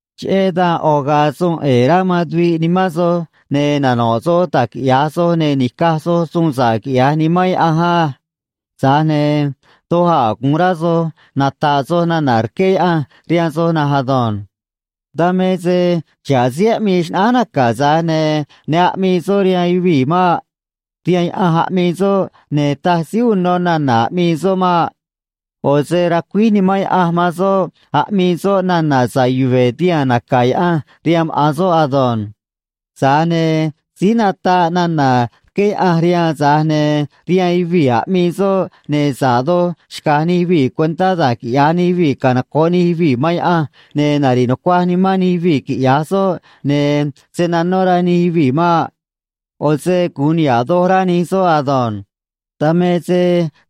Cheꞌé dan ꞌo̱ ga̱a̱ suun ꞌe̱e̱ rá man tuviꞌ nimán soj, ne̱ nano̱ꞌ soj da̱j quiꞌya̱j soj, ne̱ ni̱caj soj suun sa̱ꞌ, quiꞌya̱j Nimán Yaꞌanj á. Tza̱j ne̱ doj a̱ gu̱un rá soj nata̱ꞌ soj nana̱ rqué Yaꞌanj rihaan soj na̱nj ado̱nj. Dan me se xa̱ꞌ síí aꞌmii xnaꞌánj naca̱, tza̱j ne̱ ne aꞌmii soꞌ rihaan yuvii̱ maꞌ. Rihaan Yaꞌanj aꞌmii soꞌ, ne̱ taj síí uno nana̱ aꞌmii soꞌ maꞌ. ꞌO̱ se racuíj Nimán Yaꞌanj man soꞌ aꞌmii soꞌ nana̱ sa̱ꞌ yuve̱ tihaa̱n naca̱ Yaꞌanj rihaan maꞌa̱n soꞌ ado̱nj. Tza̱j ne̱ síí nataꞌ nana̱ rqué Yaꞌanj rihaan, tza̱j ne̱ rihaan yuvii̱ aꞌmii soꞌ, ne̱ sa̱ꞌ doj xca̱j nij yuvii̱ cuentá da̱j quiꞌya̱j nij yuvii̱ canoco̱ꞌ nij yuvii̱ man Yaꞌanj, ne̱ nari̱ꞌ nucuaj nimán nij yuvii̱, quiꞌya̱j soꞌ, ne̱ se̱ nanó rá nij yuvii̱ maꞌ. ꞌO̱ se gu̱un niha̱ꞌ doj rá nij soꞌ ado̱nj. Dan me se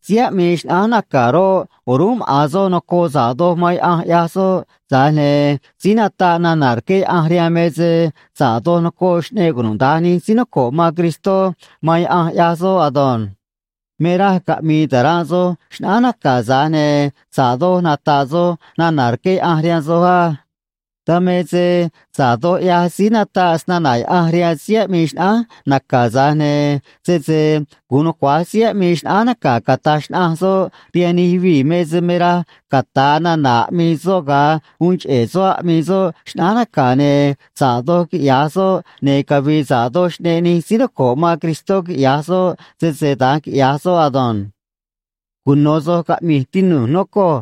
síí aꞌmii xnaꞌánj naca̱ roꞌ, o̱rúnꞌ maꞌa̱n soꞌ nocoꞌ sa̱ꞌ doj man Yaꞌanj, ꞌyaj soꞌ, tza̱j ne̱ síí nataꞌ nana̱ rqué Yaꞌanj rihaan me se sa̱ꞌ doj nocoꞌ xꞌneꞌ cunuda̱nj nij síí noco̱ꞌ man Cristó man Yaꞌanj, ꞌyaj soꞌ ado̱nj. Me raj caꞌmi̱i̱ ta̱ranꞌ soj xnaꞌánj naca̱, tza̱j ne̱ sa̱ꞌ doj nata̱ꞌ soj nana̱ rqué Yaꞌanj rihaan soj á. Dan me se sa̱ꞌ doj ꞌyaj síí nataꞌ snana̱ Yaꞌanj rihaan síí aꞌmii xnaꞌánj naca̱, tza̱j ne̱ sese gu̱un nucua̱j síí aꞌmii xnaꞌánj naca̱ cata̱j xnaꞌanj soꞌ rihaan nij yuvii̱ me se me raj cata̱a nana̱ aꞌmii soꞌ ga̱a uun cheꞌe̱ soꞌ aꞌmii soꞌ xnaꞌánj naca̱, ne̱ sa̱ꞌ doj quiꞌya̱j soꞌ, ne̱ cavi̱i̱ sa̱ꞌ doj xꞌneꞌ nij síí noco̱ꞌ man Cristó, quiꞌya̱j soꞌ, sese da̱nj quiꞌya̱j soꞌ ado̱nj. Cuno̱ soj caꞌmi̱j, tinu̱j, nocoj,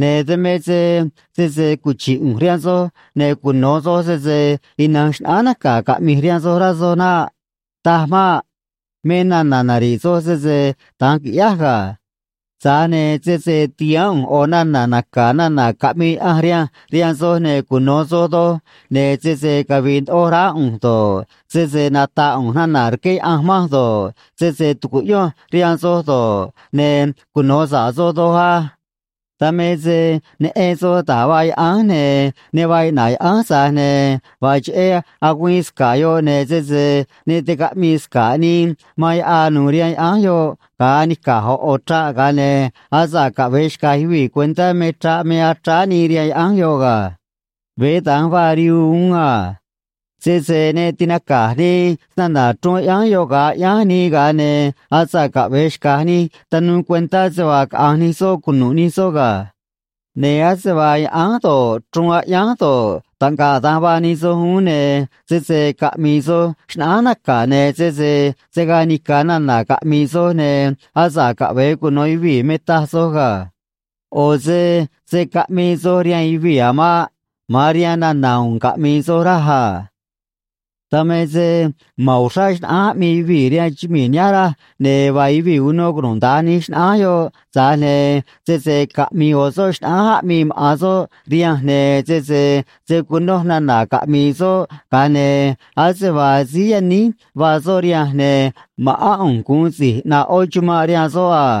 ne̱ dan me se sese cuchi̱ꞌ ꞌu̱nj rihaan soj, ne̱ cuno̱ soj sese ina̱nj xnaꞌánj naca̱ caꞌmi̱j rihaan soj, rá soj naꞌ. Taj maꞌ. Me nana̱ nari̱ꞌ soj, sese da̱nj qui̱ꞌyáj ga̱. Tza̱j ne̱ sese ti̱haán ꞌu̱nj ꞌo̱ nana̱ naca̱ nana̱ caꞌmii Yaꞌanj rihanj rihaan soj, ne̱ cuno̱ soj doj, ne̱ sese cavi̱i̱ ndoꞌo raá ꞌu̱nj do̱ꞌ, sese nata̱ꞌ ꞌu̱nj nana̱ rqué Yaꞌanj manj do̱ꞌ, sese tu̱cuꞌyonj rihaan soj do̱ꞌ, ne̱ cuno̱ sa̱ꞌ soj doj á. Dan me se neꞌen soj da̱j vaa yaꞌánj, ne̱ ne vaa iꞌna̱ꞌ yaꞌánj, tza̱j ne̱ vaa cheꞌé agüiin sca̱ꞌ yoꞌ, ne̱ sese ne ticaꞌmii sca̱ꞌ nii man yaꞌaâ nu̱u̱ rihaan yaꞌánj yoꞌ ga̱a anica̱j ꞌo̱ ꞌo̱ chraꞌ, ga̱a ne̱ asa̱ꞌ caꞌve̱e xca̱j yuvii̱ cuentá me chraꞌ me achráá nii rihaan yaꞌánj yoꞌ ga̱. Veé da̱nj vaa rihuu uún a. Sese ne tinaca̱j nii snana̱ chruun aꞌyánj yoꞌ ga̱a aꞌyánj nii, ga̱a ne̱ asa̱ꞌ caꞌve̱e xca̱j nij tanuu cuentá se vaa caꞌa̱nj nij soꞌ cunu̱ꞌ nij soꞌ ga̱. Ne̱ ase vaa yaꞌánj do̱ꞌ, chruun aꞌyánj do̱ꞌ, taꞌngaꞌ da̱nj vaa nij soj uún, ne̱ sese caꞌmi̱i̱ soj xnaꞌánj naca̱, ne̱ sese se̱ gaa nica̱ nana̱ caꞌmi̱i̱ soj, ne̱ asa̱ꞌ caꞌve̱e cuno̱ yuvii̱ me taj soj ga̱. ꞌO̱ se se̱ caꞌmii soj rihaan yuvii̱ a̱ maꞌ. Ma̱an rihaan nana̱ u̱u̱n caꞌmi̱i̱ soj, raj a. Dan me se ma̱n uxrá xnaꞌánj aꞌmii yuvii̱ rihaan chumii̱ nihánj, raj, ne̱ vaa yuvii̱ uno cunuda̱nj nij xnaꞌánj yoꞌ, tza̱j ne̱ sese caꞌmi̱i̱ ꞌo̱ soꞌ xnaꞌánj aꞌmii maꞌa̱n soꞌ rihanj, ne̱ sese se̱ cunoj nana̱ caꞌmi̱i̱ soꞌ, ga̱a ne̱ ase vaa síí yaníj vaa soꞌ rihanj, ne̱ ma̱ꞌán ꞌu̱nj gu̱un si̱j ꞌnaꞌ ꞌó chumanꞌ rihaan soꞌ a.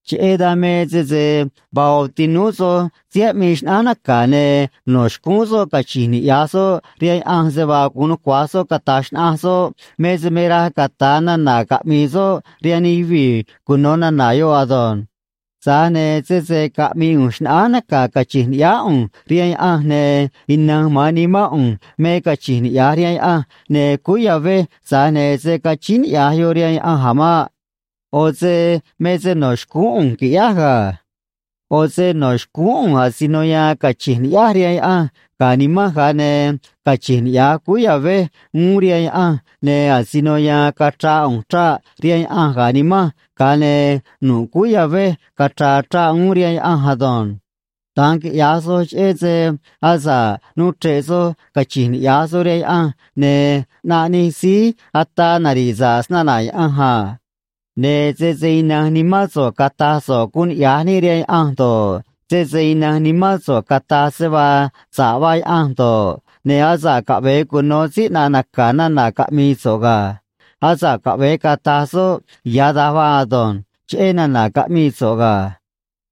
Cheꞌé dan me sese vaa ꞌo̱ tinúú soj síí aꞌmii xnaꞌánj naca̱, ne̱ no̱ xcúún soꞌ cachi̱nj niꞌya̱j soꞌ rihaan Yaꞌanj se vaa gu̱un nucua̱j soꞌ cata̱j xnaꞌanj soꞌ me se me raj cata̱a nana̱ caꞌmi̱i̱ soꞌ rihaan nij yuvii̱ cuno̱ nana̱ yoꞌ ado̱nj. Tza̱j ne̱ sese caꞌmi̱i̱ ꞌu̱nj xnaꞌánj naca̱ cachi̱nj ni̱ꞌyáá ꞌu̱nj rihaan Yaꞌanj, ne̱ ina̱nj ma̱an nimán ꞌu̱nj me cachi̱nj niꞌya̱j rihaan Yaꞌanj, ne̱ cúú ya̱vej, tza̱j ne̱ se̱ cachíín niꞌya̱j yoꞌ rihaan Yaꞌanj a̱ maꞌ. ꞌO̱ se me se no̱ xcúún ꞌu̱nj qui̱ꞌyáj ga̱. ꞌO̱ se no̱ xcúún ꞌu̱nj asino ya̱a̱n cachi̱nj ni̱ꞌyáj rihaan Yaꞌanj ga̱ nimanj, ga̱a ne̱ cachi̱nj niꞌya̱j cúú ya̱vej uún rihaan Yaꞌanj, ne̱ asino ya̱a̱n cachra̱a̱ ꞌu̱nj chraꞌ rihaan Yaꞌanj ga̱ nimanj, ga̱a ne̱ nu̱ꞌ cúú ya̱vej cachra̱a̱ chraꞌ uún rihaan Yaꞌanj ado̱nj. Da̱nj quiꞌya̱j soj cheꞌé se asa̱ꞌ nuu chre̱ꞌ soj cachi̱nj niꞌya̱j soj rihaan Yaꞌanj, ne̱ ꞌnaꞌ nij síí ataa nari̱ꞌ sa̱ꞌ snana̱ Yaꞌanj a. Ne̱ sese ina̱nj nimán so̱ꞌ cata̱j so̱ꞌ guun niꞌya̱j níꞌ rihaan Yaꞌanj do̱ꞌ, sese ina̱nj nimán so̱ꞌ cata̱j se vaa sa̱ꞌ vaa Yaꞌanj do̱ꞌ, ne̱ asa̱ꞌ caꞌve̱e cuno̱ síí ꞌnaꞌ naca̱ nana̱ caꞌmi̱i̱ so̱ꞌ ga̱. Asa̱ꞌ caꞌve̱e cata̱j soꞌ “Ya̱ da̱nj vaa ado̱nj” cheꞌé nana̱ caꞌmii so̱ꞌ ga̱.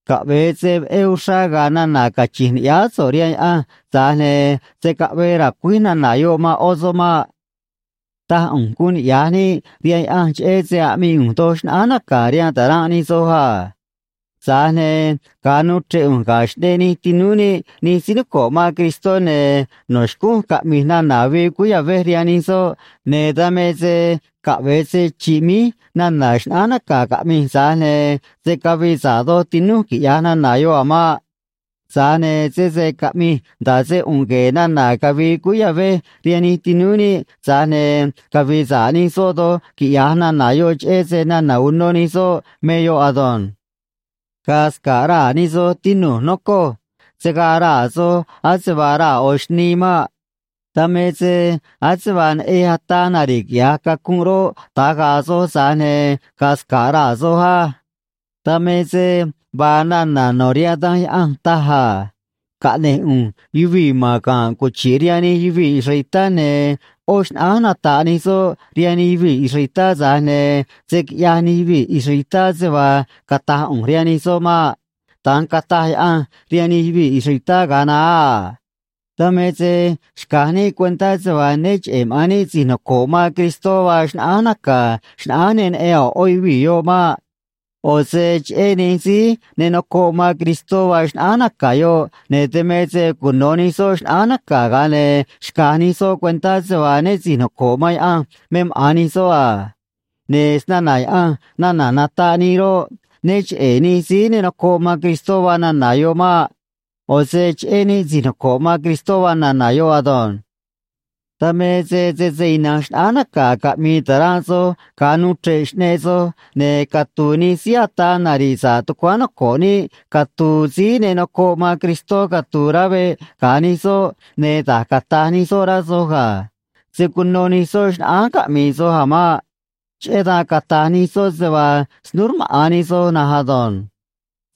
Caꞌve̱e se veꞌé uxrá ga̱a̱ nana̱ cachi̱nj ni̱ꞌyáá so̱ꞌ rihaan Yaꞌanj, tza̱j ne̱ se̱ caꞌvee ra̱cuíj nana̱ yoꞌ man ꞌó soꞌ maꞌ. Taj ꞌu̱nj guun niꞌya̱j níꞌ rihaan Yaꞌanj cheꞌé se aꞌmii ꞌu̱nj doj xnaꞌánj naca̱ rihaan ta̱ranꞌ nij soj a. Tza̱j ne̱ ga̱a nuu chre̱ꞌ ꞌu̱nj ga̱ xꞌneꞌ nij tinúú níꞌ nij síí noco̱ꞌ man Cristó, ne̱ no̱ xcúnj caꞌmi̱j nana̱ avii cúú ya̱vej rihaan nij soꞌ, ne̱ dan me se caꞌve̱e se chi̱ꞌ míj nana̱ xnaꞌánj naca̱ caꞌmi̱j, tza̱j ne̱ se̱ cavii sa̱ꞌ doj tinúj, quiꞌya̱j nana̱ yoꞌ a̱ maꞌ. Tza̱j ne̱ sese caꞌmi̱j nda̱ꞌ se ꞌu̱nꞌ gue̱e̱ nana̱ cavi̱i̱ cúú ya̱vej rihaan nij tinúú níꞌ, tza̱j ne̱ cavi̱i̱ sa̱ꞌ nij soꞌ doj, quiꞌya̱j nana̱ yoꞌ, cheꞌé se nana̱ uno nij soꞌ me yoꞌ ado̱nj. Ga̱a̱ sca̱ꞌ raa̱ nij soj, tinu̱j, nocoj. Se̱ gaa raa̱ soj ase vaa raa̱ ꞌo̱ xnii maꞌ. Dan me se ase vaa neꞌej ataa nari̱ꞌ quiꞌya̱j cacunꞌ roꞌ, da̱nj ga̱a̱ soj, tza̱j ne̱ ga̱a̱ sca̱ꞌ raa̱ soj á. Dan me se vaa nana̱ no̱ rihaan Danj Yaꞌanj taj a: “Caꞌne̱j ꞌu̱nj yuvii̱ ma̱n ga̱nꞌ cuchi̱ꞌ rihaan nij yuvii̱ israelitá, ne̱ ꞌó xnaꞌánj nata̱ꞌ nij soꞌ rihaan nij yuvii̱ israelitá, tza̱j ne̱ se̱ quiꞌyaj nij yuvii̱ israelitá se vaa cata̱j ꞌu̱nj rihaan nij soꞌ maꞌ.” Da̱nj cataj Yaꞌanj rihaan nij yuvii̱ israelitá ga̱a naá a. Dan me se xca̱j níꞌ cuentá se vaa né cheꞌe̱ maꞌa̱n níꞌ si̱j noco̱ꞌ man Cristó vaa xnaꞌánj naca̱ xnaꞌánj ne neꞌen a̱ ꞌó yuvii̱ yoꞌ maꞌ. ꞌO̱ se cheꞌé nij síí ne nocoꞌ man Cristó vaa xnaꞌánj naca̱ yoꞌ, ne̱ dan me se cuno̱ nij soꞌ xnaꞌánj naca̱, ga̱a ne̱ xca̱j nij soꞌ cuentá se vaa né si̱j noco̱ꞌ man Yaꞌanj me maꞌa̱n nij soꞌ a. Ne̱ snana̱ Yaꞌanj nana̱ nataꞌ nii roꞌ, né cheꞌe̱ nij síí ne nocoꞌ man Cristó vaa nana̱ yoꞌ maꞌ. ꞌO̱ se cheꞌé níꞌ si̱j noco̱ꞌ man Cristó vaa nana̱ yoꞌ ado̱nj. Dan me se sese ina̱nj xnaꞌánj naca̱ caꞌmi̱i̱ ta̱ranꞌ soj ga̱a nuu chre̱ꞌ xꞌneꞌ soj, ne̱ catu̱u̱ nij síí ataa nari̱ꞌ sa̱ꞌ tucuáán noco̱ꞌ níꞌ catu̱u̱ síí ne nocoꞌ man Cristó catu̱u̱ rá veꞌ ga̱ nij soj, ne̱ da̱j cata̱j nij soꞌ, rá soj ga̱. Se̱ cuno nij soꞌ xnaꞌánj caꞌmii soj a̱ maꞌ. Cheꞌé dan cata̱j nij soꞌ se vaa snúú rmaꞌa̱n nij soj na̱nj ado̱nj.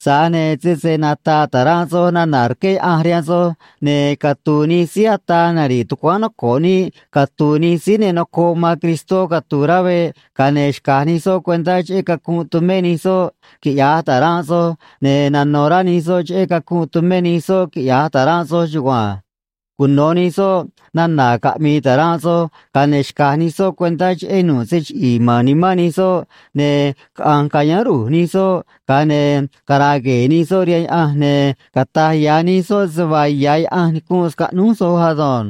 Tza̱j ne̱ sese nata̱ꞌ ta̱ranꞌ soj nana̱ rqué Yaꞌanj rihaan soj, ne̱ catu̱u̱ nij síí ataa nari̱ꞌ tucuáán noco̱ꞌ níꞌ catu̱u̱ nij síí ne nocoꞌ man Cristó catu̱u̱ rá veꞌ, ga̱a ne̱ xca̱j nij soꞌ cuentá cheꞌé cacunꞌ tumé nij soꞌ, quiꞌya̱j ta̱ranꞌ soj, ne̱ nano̱ rá nij soꞌ cheꞌé cacunꞌ tumé nij soꞌ, quiꞌya̱j ta̱ranꞌ soj chugua̱nj. Cuno̱ nij soꞌ nana̱ caꞌmi̱i̱ ta̱ranꞌ soj, ga̱a ne̱ xca̱j nij soꞌ cuentá cheꞌé nu̱ꞌ se chiꞌi̱i̱ ma̱n nimán nij soꞌ, ne̱ caꞌa̱nj ca̱yáán ru̱j nij soꞌ, ga̱a ne̱ cara̱a̱ gue̱e̱ nij soꞌ rihaan Yaꞌanj, ne̱ cata̱j ya̱ nij soꞌ se vaa ya̱ Yaꞌanj nicunꞌ scaꞌnúj soj ado̱nj.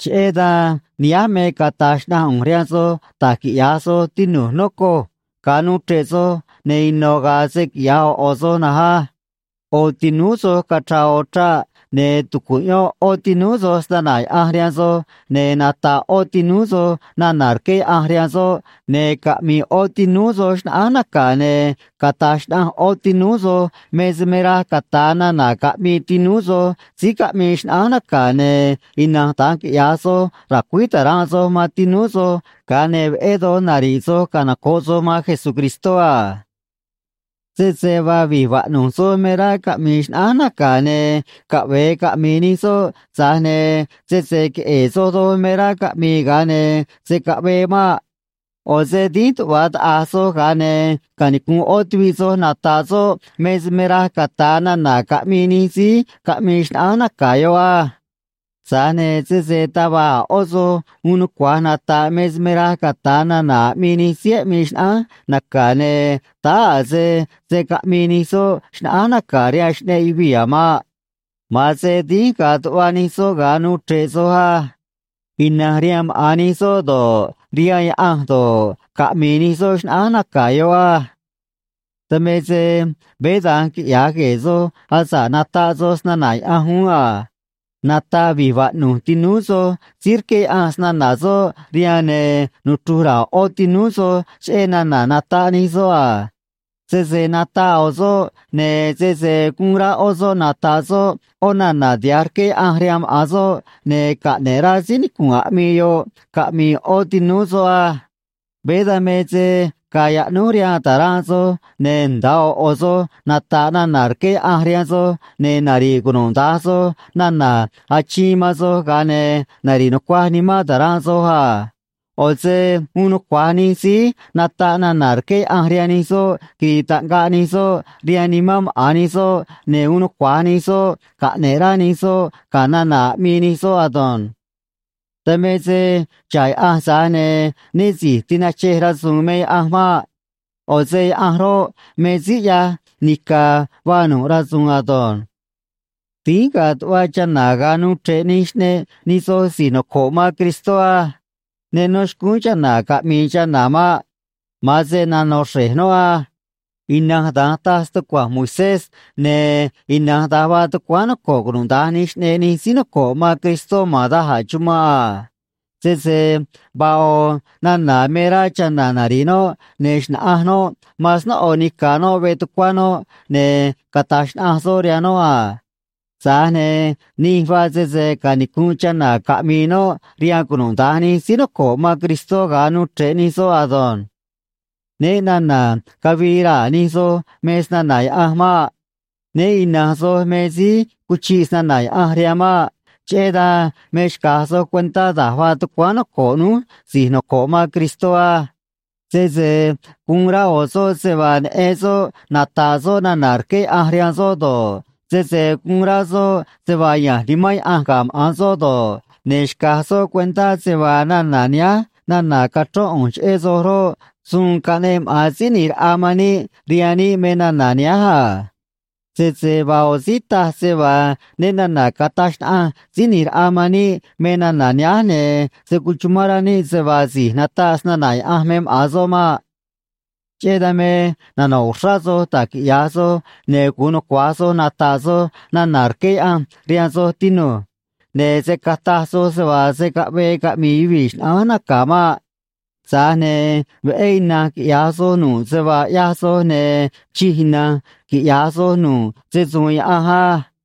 Cheꞌé dan nihánj me cata̱j xnaꞌanj ꞌu̱nj rihaan soj da̱j quiꞌya̱j soj, tinu̱j, nocoj. Ga̱a nuu chre̱ꞌ soj, ne̱ ino̱ ga̱a̱ se quiꞌya̱j ꞌo̱ ꞌo̱ soj na̱nj á. ꞌO̱ tinúú soj cachra̱a̱ ꞌo̱ chraꞌ, ne̱ tu̱cuꞌyón ꞌó tinúú soj snana̱ Yaꞌanj rihaan soj, ne̱ nata̱ꞌ ꞌó tinúú soj nana̱ rqué Yaꞌanj rihaan soꞌ, ne̱ caꞌmi̱i̱ ꞌó tinúú soj xnaꞌánj naca̱, ne̱ cata̱j xnaꞌanj ꞌó tinúú soj me se me raj cata̱a nana̱ caꞌmii tinúú soj síí caꞌmii xnaꞌánj naca̱, ne̱ ina̱nj da̱nj quiꞌya̱j soj, ra̱cuíj ta̱ranꞌ soj man tinúú soj, ga̱a ne̱ veꞌé doj nari̱ꞌ soj canoco̱ꞌ soj man Jesucristó a. Sese vaa vi̱j vaꞌnu̱j soj me rá caꞌmi̱i̱ xnaꞌánj naca̱, ne̱ caꞌve̱e caꞌmi̱i̱ nij soꞌ, tza̱j ne̱ sese queꞌe̱e̱ soj doj me rá caꞌmi̱i̱, ga̱a ne̱ se̱ caꞌvee maꞌ. ꞌO̱ se dínj tuꞌva taꞌa̱j soj, ga̱a ne̱ canicu̱nꞌ ꞌó tuviꞌ soj nata̱ꞌ soꞌ me se me raj cata̱a nana̱ caꞌmii nij síí caꞌmii xnaꞌánj naca̱ yoꞌ á. Tza̱j ne̱ sese taj va̱j a̱ ꞌó soj uun nucua̱j nata̱ꞌ me se me raj cata̱a nana̱ aꞌmii nij síí aꞌmii xnaꞌánj naca̱, ne̱ táá a̱ se se̱ caꞌmii nij soꞌ xnaꞌánj naca̱ rihaan xꞌneꞌ yuvii̱ a̱ maꞌ. Ma̱an se dínj ga̱a̱ tuꞌva nij soꞌ ga̱a nuu chre̱ꞌ soj á. Ina̱nj rihaan maꞌa̱n nij soꞌ do̱ꞌ, rihaan Yaꞌanj do̱ꞌ, caꞌmi̱i̱ nij soꞌ xnaꞌánj naca̱ yoꞌ á. Dan me se veé da̱nj quiꞌya̱j gue̱e̱ soj asa̱ꞌ nataꞌ soj snana̱ Yaꞌanj uún a. Nata̱ꞌ vi̱j vaꞌnu̱j tinúú soj, síí rqué Yaꞌanj snana̱ soꞌ rihaan, ne̱ nuchru̱j ra̱a̱ ꞌó tinúú soj cheꞌé nana̱ nataꞌ nij soꞌ a. Sese nataꞌ ꞌo̱ soꞌ, ne̱ sese gu̱un rá ꞌó soꞌ nata̱ꞌ soꞌ ꞌó nana̱ tiha̱j rqué Yaꞌanj rihaan maꞌa̱n soꞌ, ne̱ caꞌne̱ꞌ rá síí nicu̱nꞌ aꞌmii yoꞌ caꞌmi̱i̱ ꞌó tinúú soꞌ á. Veé dan me se ga̱a̱ yaꞌnúj rihaan ta̱ranꞌ soj, ne̱ nda̱a ꞌo̱ ꞌo̱ soj nata̱ꞌ nana̱ rqué Yaꞌanj rihaan soj, ne̱ nari̱ꞌ cunuda̱nj soj nana̱ achiin man soj, ga̱a ne̱ nari̱ꞌ nucuaj nimán ta̱ranꞌ soj a. ꞌO̱ se uun nucua̱j nij síí nataꞌ nana̱ rqué Yaꞌanj rihaan nij soꞌ quiri̱i̱ taꞌngaꞌ nij soꞌ rihaan nimán maꞌa̱n nij soꞌ, ne̱ uun nucua̱j nij soꞌ caꞌne̱ꞌ rá nij soꞌ ga̱ nana̱ aꞌmii nij soꞌ ado̱nj. Dan me se xa̱ꞌ Yaꞌanj, tza̱j ne̱ né si̱j tinachej rasu̱u̱n me Yaꞌanj maꞌ. ꞌO̱ se Yaꞌanj roꞌ, me síí ꞌyaj nica̱ vaa nu̱ꞌ rasu̱u̱n ado̱nj. Dínj ga̱a̱ tuꞌva chana̱ ga̱a nuu chre̱ꞌ nij xꞌneꞌ nij soj si̱j noco̱ꞌ man Cristó á. Ne nó xcúún chana̱ caꞌmi̱i̱ chana̱ maꞌ. Ma̱an se nano̱ xre̱j noꞌ á. Ina̱nj da̱nj taj stucua̱nj Moisés, ne̱ ina̱nj da̱nj vaa tucuáán noco̱ꞌ cunuda̱nj nij xꞌneꞌ nij síí noco̱ꞌ man Cristó ma̱n da̱j a̱ chumanꞌ a. Sese vaa ꞌo̱ nana̱ me rá chana̱ nari̱ꞌ noꞌ, ne̱ xna̱ꞌanj noꞌ man snóꞌo nica̱ noꞌ veꞌ tucuá noꞌ, ne̱ cata̱j xnaꞌanj soꞌ rihaan noꞌ a. Tza̱j ne̱ nij vaa sese canicu̱nꞌ chana̱ caꞌmi̱i̱ noꞌ rihaan cunuda̱nj nij síí noco̱ꞌ man Cristó ga̱a nuu chre̱ꞌ nij soꞌ ado̱nj. Né na̱na̱ cavii raa̱ nij soj me snana̱ Yaꞌanj maꞌ. Né ina̱nj soj me síí cuchiꞌ snana̱ Yaꞌanj rihaan maꞌ. Cheꞌé dan me xca̱j soj cuentá da̱j vaa tucuáán noco̱ꞌ núj si̱j noco̱ꞌ man Cristó á. Sese guun rá ꞌo̱ soꞌ se vaa neꞌen soꞌ nata̱ꞌ soꞌ nana̱ rqué Yaꞌanj rihaan soꞌ do̱ꞌ, sese guun rá soꞌ se vaa ya̱nj Nimán Yaꞌanj ga̱ maꞌa̱n soꞌ do̱ꞌ, ne̱ xca̱j soꞌ cuentá se vaa nana̱ nihánj nana̱ cachrón ꞌu̱nj cheꞌé soj roꞌ, suun caꞌneꞌ maꞌa̱n Síí ꞌNi̱j Raꞌa man níꞌ rihaan níꞌ me nana̱ nihánj a. Sese vaa ꞌo̱ síí taj se vaa né na̱na̱ cataj xnaꞌanj Síí ꞌNi̱j Raꞌa man níꞌ me nana̱ nihánj, ne̱ se̱ cuchumán rá níꞌ se vaa si̱j nataꞌ snana̱ Yaꞌanj me maꞌa̱n soꞌ maꞌ. Cheꞌé dan me nano̱ꞌ uxrá soj da̱j quiꞌya̱j soj, ne̱ gu̱un nucua̱j soj nata̱ꞌ soj nana̱ rqué Yaꞌanj rihaan soj, tinu̱j. Ne̱ se̱ cataj soj se vaa se̱ caꞌvee caꞌmi̱i̱ yuvii̱ xnaꞌánj naca̱ maꞌ. Tza̱j ne̱ veꞌé ina̱nj quiꞌya̱j soj nu̱ꞌ se vaa ꞌyaj soj, ne̱ chij ina̱nj quiꞌya̱j soj nu̱ꞌ se‑su̱u̱n Yaꞌanj á.